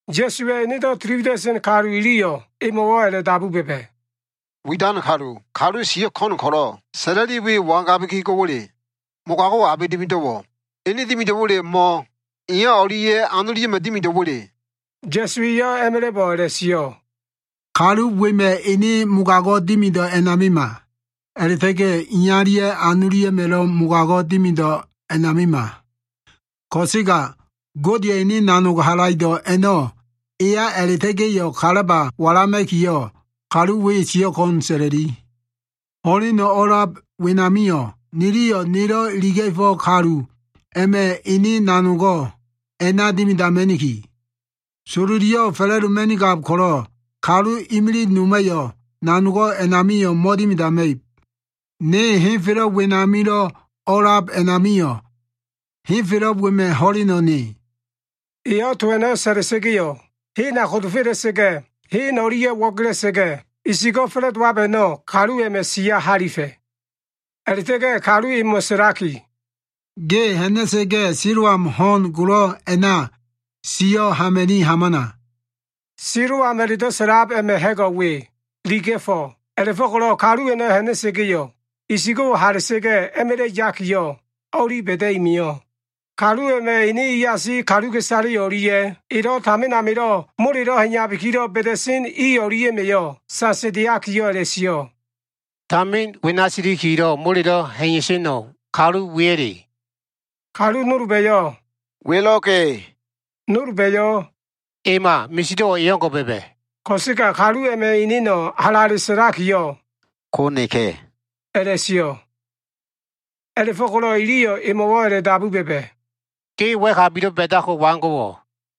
Ya꞉suwa꞉ enedo꞉ tili wida꞉sen kalu iliyo꞉ emo꞉wo꞉ a꞉la꞉dabu ba꞉ba꞉, “Widan kalu, kalu siyo꞉ ko꞉n ko꞉lo꞉ sa꞉la꞉li we wangabiki go꞉wa꞉le? Mogago꞉wo꞉ abe dimido꞉wo꞉? Ene dimido꞉wa꞉le, mo꞉ iya o꞉lia꞉ anolia꞉ma꞉ dimido꞉wa꞉le?” Ya꞉su eyo꞉ a꞉ma꞉la꞉bo꞉ a꞉la꞉sio꞉, “Kalu wema꞉ ene mogago꞉ dimido꞉ a꞉namima. A꞉la꞉ta꞉ga꞉ iyalia꞉ anolia꞉ma꞉lo꞉ mogago꞉ dimido꞉ a꞉namima. Ko꞉sega Godeya꞉ ene nanog halaido꞉ a꞉no꞉ eya a꞉la꞉ta꞉ga꞉yo꞉ kalaba walama꞉kiyo꞉, kalu we siyo꞉ ko꞉n sa꞉la꞉li. Ho꞉leno꞉ o꞉lab wenamio꞉, niliyo꞉ nelo꞉ iliga꞉fo꞉ kalu a꞉ma꞉ ene nanogo꞉ a꞉na dimidama꞉niki. Sololiyo꞉ fa꞉la꞉doma꞉nigab ko꞉lo꞉ kalu imilig noma꞉yo꞉ nanogo꞉ a꞉namio꞉ mo꞉dimidama꞉ib. Ne henfelo꞉ wenamilo꞉ o꞉a꞉lab a꞉namio꞉, henfelo꞉ wema꞉ ho꞉leno꞉ ne.” Eyo꞉ to a꞉no꞉ sa꞉la꞉sa꞉ga꞉yo꞉, hena kodofela꞉sa꞉ga꞉, hen o꞉lia꞉ wo꞉gela꞉sa꞉ga꞉, isigo꞉ fa꞉la꞉dowab a꞉no꞉ kalu a꞉ma꞉ siya halifa꞉. A꞉la꞉ta꞉ga꞉ kalu emo꞉ sa꞉laki, “Ge ha꞉na꞉sa꞉ga꞉ Siloam ho꞉n golo꞉ a꞉na siyo꞉ hama꞉ni hamana.” Siloam a꞉la꞉do꞉ sa꞉lab a꞉ma꞉ ha꞉go꞉ we, iliga꞉fo꞉. A꞉la꞉fo꞉ko꞉lo꞉ kalu a꞉no꞉ ha꞉na꞉sa꞉ga꞉yo꞉, isigo꞉wo꞉ hala꞉sa꞉ga꞉ a꞉ma꞉la꞉ yakiyo꞉ o꞉li ba꞉da꞉i mio꞉. Kalu a꞉ma꞉ ene iasi kaluka꞉isale o꞉lia꞉ elo꞉ tamin amilo꞉ molelo꞉ ha꞉iya꞉labikilo꞉ ba꞉da꞉sen i o꞉lia꞉ma꞉yo꞉ sasandeakiyo꞉ a꞉la꞉sio꞉, “Tamin wena silikilo꞉ molelo꞉ ha꞉iya꞉seno꞉, kalu weya꞉le?” Kalu nolba꞉yo꞉ “Welo꞉ka꞉.” Nolba꞉yo꞉ “Ema. Misido꞉wo꞉ e o꞉ngo꞉ ba꞉ba꞉.” Ko꞉sega kalu a꞉ma꞉ eneno꞉ halale sa꞉laki, “Ko neka꞉” a꞉la꞉sio꞉. A꞉la꞉fo꞉ko꞉lo꞉ iliyo꞉ emo꞉wo꞉ a꞉la꞉dabu ba꞉ba꞉, “Ge wa꞉kabilo꞉ ba꞉dako꞉ waigo꞉wo꞉?”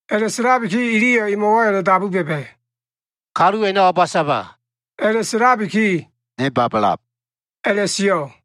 A꞉la꞉sa꞉labiki iliyo꞉ emo꞉wo꞉ a꞉la꞉dabu ba꞉ba꞉, “Kalu a꞉no꞉ o꞉ba saba?” A꞉la꞉sa꞉labiki, “Ne babalab” a꞉la꞉sio꞉.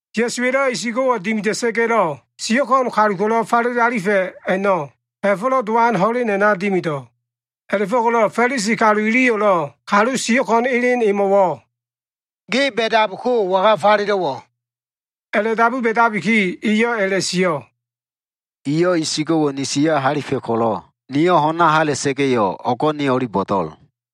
Ya꞉suwa꞉lo꞉ isigo꞉wo꞉ dimida꞉sa꞉ga꞉lo꞉ siyo꞉ ko꞉n kalulo꞉ falele alifa꞉ a꞉no꞉, Ha꞉fo꞉lo꞉ Dowan ho꞉len a꞉na dimido꞉. A꞉la꞉fo꞉ko꞉lo꞉ Fa꞉lisi kalu iliyo꞉lo꞉ kalu siyo꞉ ko꞉n elen emo꞉wo꞉, “Ge ba꞉dako꞉ waga falelo꞉wo꞉?” A꞉la꞉dabu ba꞉dabiki, eyo꞉ a꞉la꞉sio꞉, “Eyo꞉ isigo꞉wo꞉ ni siya halifa꞉ ko꞉lo꞉, niyo꞉ ho꞉na hala꞉sa꞉ga꞉yo꞉, o꞉go꞉ ne o꞉li bo꞉do꞉l.”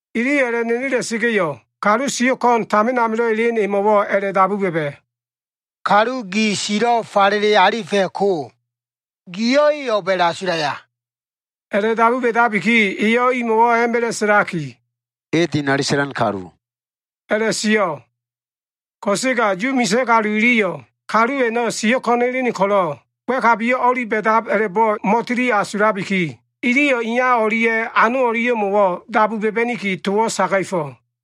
Iliyo꞉ a꞉la꞉nenela꞉sa꞉ga꞉yo꞉, kalu siyo꞉ ko꞉n tamin amilo꞉ elen emo꞉wo꞉ a꞉la꞉dabu ba꞉ba꞉, “Kalu gi silo꞉ falele alifa꞉ ko, giyo꞉ e o꞉b a꞉la꞉asulaya?” A꞉la꞉dabu ba꞉dabiki, eyo꞉ imo꞉wo꞉ a꞉ma꞉la꞉ sa꞉laki, “E dinali sa꞉lan kalu” a꞉la꞉sio꞉. Ko꞉sega Yu misa꞉ kalu iliyo꞉, kalu a꞉no꞉ siyo꞉ ko꞉n elen ko꞉lo꞉ wa꞉kabiyo꞉ o꞉li ba꞉dab a꞉la꞉bo꞉ mo꞉tili asulabiki, iliyo꞉ iya o꞉lia꞉ anolia꞉mo꞉wo꞉ dabu ba꞉ba꞉niki, towo꞉ saga꞉fo꞉.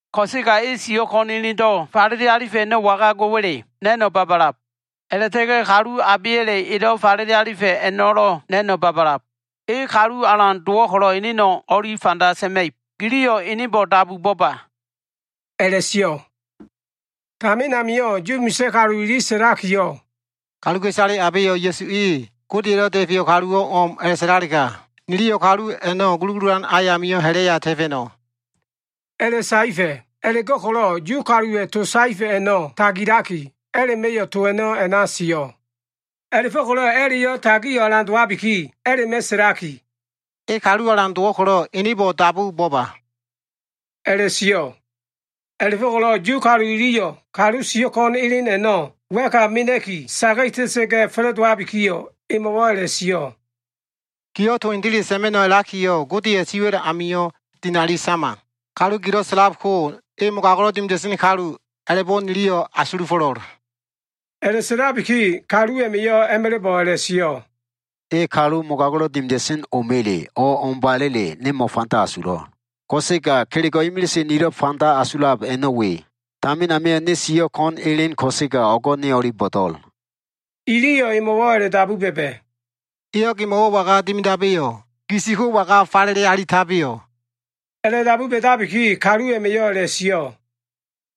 Ko꞉sega e siyo꞉ ko꞉n elendo꞉ falele alifa꞉ a꞉no꞉ waga go꞉wa꞉le na꞉no꞉ babalab. A꞉la꞉ta꞉ga꞉ kalu abeya꞉le elo꞉ falele alifa꞉ a꞉no꞉lo꞉ na꞉no꞉ babalab. E kalu alan dowo꞉ ko꞉lo꞉ eneno꞉ o꞉li fanda sa꞉ma꞉ib. Giliyo꞉ enebo꞉ dabu bo꞉ba” a꞉la꞉sio꞉. Tamin amio꞉ Yu misa꞉ kalu ili sa꞉lakiyo꞉, “Kaluka꞉isale abeyo꞉ Ya꞉su e Godeya꞉lo꞉ Da꞉feyo꞉ kaluwo꞉ o꞉m a꞉la꞉sa꞉lalega, niliyo꞉ kalu a꞉no꞉ gulugululan ayamio꞉ ha꞉la꞉ya ta꞉fa꞉no꞉” a꞉la꞉saefa꞉. A꞉la꞉go꞉ko꞉lo꞉ Yu kaluwa꞉ to saefa꞉ a꞉no꞉ tagilaki, a꞉la꞉ma꞉yo꞉ to a꞉no꞉ a꞉na sio꞉. A꞉la꞉fo꞉ko꞉lo꞉ a꞉la꞉yo꞉ tagio꞉ alan dowabiki, a꞉la꞉ma꞉ sa꞉laki “E kalu alan dowo꞉ ko꞉lo꞉ enebo꞉ dabu bo꞉ba,” a꞉la꞉sio꞉. A꞉la꞉go꞉ko꞉lo꞉ Yu kalu iliyo꞉ kalu siyo꞉ ko꞉n elen a꞉no꞉ wa꞉ka mena꞉ki saga꞉ta꞉sa꞉ga꞉ fa꞉la꞉dowabikiyo꞉, emo꞉wo꞉ a꞉la꞉sio꞉, “Giyo꞉ to hendele sa꞉ma꞉no꞉ a꞉lakiyo꞉, Godeya꞉ siwa꞉l amio꞉ dinali sama. Kalu gilo꞉ sa꞉lab ko, e mogago꞉lo꞉ dimida꞉sen kalu a꞉la꞉bo꞉ niliyo꞉ asulufo꞉lo꞉l.” A꞉la꞉sa꞉labiki kalu a꞉ma꞉yo꞉ a꞉ma꞉la꞉bo꞉ a꞉la꞉sio꞉, “E kalu mogago꞉lo꞉ dimida꞉sen o꞉ma꞉le mo꞉ o꞉mbala꞉le, ne mo꞉fanda asulo꞉. Ko꞉sega kelego꞉ imilise nilo꞉ fanda asulab a꞉no꞉ we. Tamin amio꞉ ne sio꞉ ko꞉n elen ko꞉sega, o꞉go꞉ ne o꞉li bo꞉do꞉l.” Iliyo꞉ emo꞉wo꞉ a꞉la꞉dabu ba꞉ba꞉, “Eyo꞉ gemo꞉wo꞉ waga dimidabeyo꞉? Gi si ko waga falele alitabeyo꞉?” A꞉la꞉dabu ba꞉dabiki, kalu a꞉ma꞉yo꞉ a꞉la꞉sio꞉,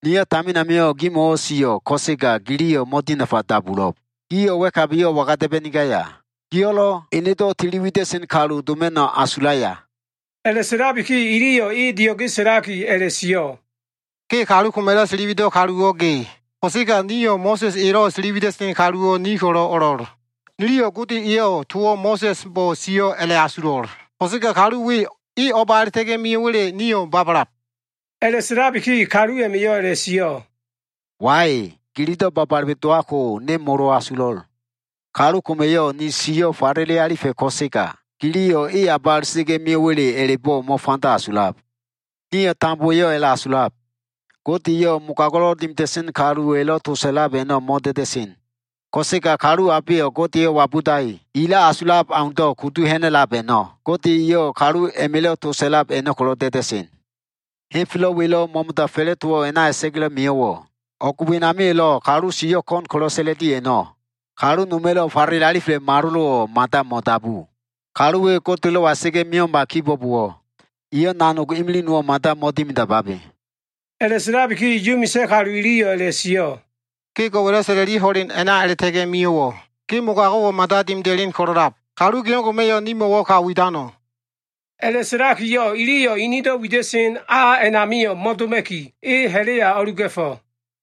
“Niyo꞉ tamin amio꞉ gimo꞉wo꞉ sio꞉ ko꞉sega giliyo꞉ mo꞉dinafa dabulo꞉b. Gio꞉ wa꞉kabiyo꞉ waga da꞉ba꞉nigaya? Gio꞉lo꞉ enedo꞉ tiliwida꞉sen kalu doma꞉no꞉ asulaya?” A꞉la꞉sa꞉labiki iliyo꞉ e dio꞉ge sa꞉laki a꞉la꞉sio꞉, “Ge kalu koma꞉lo꞉ tiliwido꞉ kaluwo꞉ ge. Ko꞉sega nio꞉ Mo꞉sa꞉s elo꞉ tiliwida꞉sen kaluwo꞉ ni ko꞉lo꞉ o꞉lo꞉l. Niliyo꞉ Gode eyo꞉ towo꞉ Mo꞉sa꞉sbo꞉ sio꞉ a꞉la꞉asulo꞉. Ko꞉sega kalu we, e o꞉ba a꞉la꞉ta꞉ga꞉ mio꞉wa꞉le nio꞉ babalab.” A꞉la꞉sa꞉labiki kalu a꞉ma꞉yo꞉ a꞉la꞉sio꞉, “Wai, gililo꞉ babale dowab ko, ne molo asulo꞉l. Kalu koma꞉yo꞉ ni siyo꞉ falele alifa꞉ ko꞉sega, giliyo꞉ e o꞉ba a꞉la꞉ta꞉ga꞉ mio꞉wa꞉le a꞉la꞉bo꞉ mo꞉fanda asulab. Nio꞉ tambowa꞉yo꞉ a꞉la꞉asulab. Gode eyo꞉ mogago꞉lo꞉ dimida꞉sen kaluwa꞉lo꞉ to sa꞉lab a꞉no꞉ mo꞉da꞉da꞉sen. Ko꞉sega kalu abeyo꞉ Godeyo꞉ wabudaki, elo꞉ asulab aundo꞉ kudu ha꞉na꞉lab a꞉no꞉, Gode eyo꞉ kalu a꞉ma꞉lo꞉ to sa꞉lab a꞉no꞉ ko꞉lo꞉ da꞉da꞉sen. Henfelo꞉ welo꞉ mo꞉mo꞉da fa꞉la꞉dowo꞉ a꞉na a꞉la꞉ta꞉ga꞉lo꞉ mio꞉wo꞉, o꞉g wenamio꞉lo꞉ kalu sio꞉ ko꞉n ko꞉lo꞉ sa꞉la꞉li a꞉no꞉, kalu noma꞉lo꞉ falele alifa꞉ malolo꞉wo꞉ mada mo꞉dabu. Kalu we Godelo꞉wa a꞉la꞉ta꞉ga꞉ mio꞉ma kibo꞉bowo꞉, eyo꞉ nanog imilig nowo꞉ mada mo꞉dimidamabe.” A꞉la꞉sa꞉labiki Yu misa꞉ kalu iliyo꞉ a꞉la꞉sio꞉, “Ge go꞉wa꞉lo꞉ sa꞉la꞉li ho꞉len a꞉na a꞉la꞉ta꞉ga꞉ mio꞉wo꞉, ge mogago꞉wo꞉ mada dimida꞉len ko꞉lo꞉lab. Kalu ge o꞉ngo꞉ma꞉yo꞉ nimo꞉wo꞉ ka widano꞉?” A꞉la꞉sa꞉lakiyo꞉ iliyo꞉ inido꞉ wida꞉sen a a꞉namio꞉ mo꞉doma꞉ki, e ha꞉la꞉ya o꞉luga꞉fo꞉.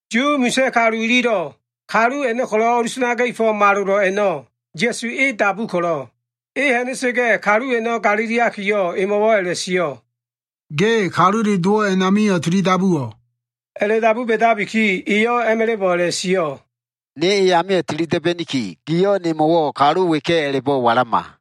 Yu misa꞉ kalu ililo꞉ kalu a꞉no꞉ ko꞉lo꞉ o꞉lusanaga꞉fo꞉ malolo꞉ a꞉no꞉ Ya꞉su e dabu ko꞉lo꞉, e ha꞉na꞉sa꞉ga꞉ kalu a꞉no꞉ galiliakiyo꞉ emo꞉wo꞉ a꞉la꞉sio꞉, “Ge Kalule Dowo꞉ a꞉namio꞉ tilidabuwo꞉?” A꞉la꞉dabu ba꞉dabiki, eyo꞉ a꞉ma꞉la꞉bo꞉ a꞉la꞉sio꞉, “Ne e amio꞉ tili da꞉ba꞉niki, giyo꞉ nemo꞉wo꞉ kalu weka꞉ a꞉la꞉bo꞉ walama.”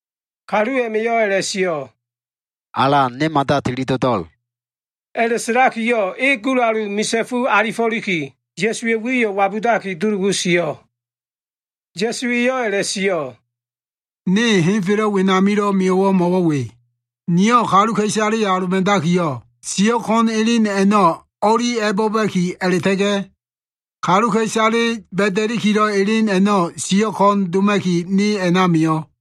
Kalu a꞉ma꞉yo꞉ a꞉la꞉sio꞉, “Alan, ne mada tili do꞉do꞉l” a꞉la꞉sa꞉lakiyo꞉ e gulalu misa꞉fu asifo꞉liki, Ya꞉suwa꞉ wiyo꞉ wabudaki dulugu sio꞉. Ya꞉su eyo꞉ a꞉la꞉sio꞉, “Ne henfelo꞉ wenamilo꞉ mio꞉wo꞉ mo꞉wo꞉ we. Niyo꞉ kaluka꞉isaleyo꞉ aloba꞉dakiyo꞉, siyo꞉ ko꞉n elen a꞉no꞉ o꞉li a꞉bo꞉ba꞉ki, a꞉la꞉ta꞉ga꞉ kaluka꞉isale ba꞉da꞉likilo꞉ elen a꞉no꞉ siyo꞉ ko꞉n doma꞉ki, ne a꞉na mio꞉.”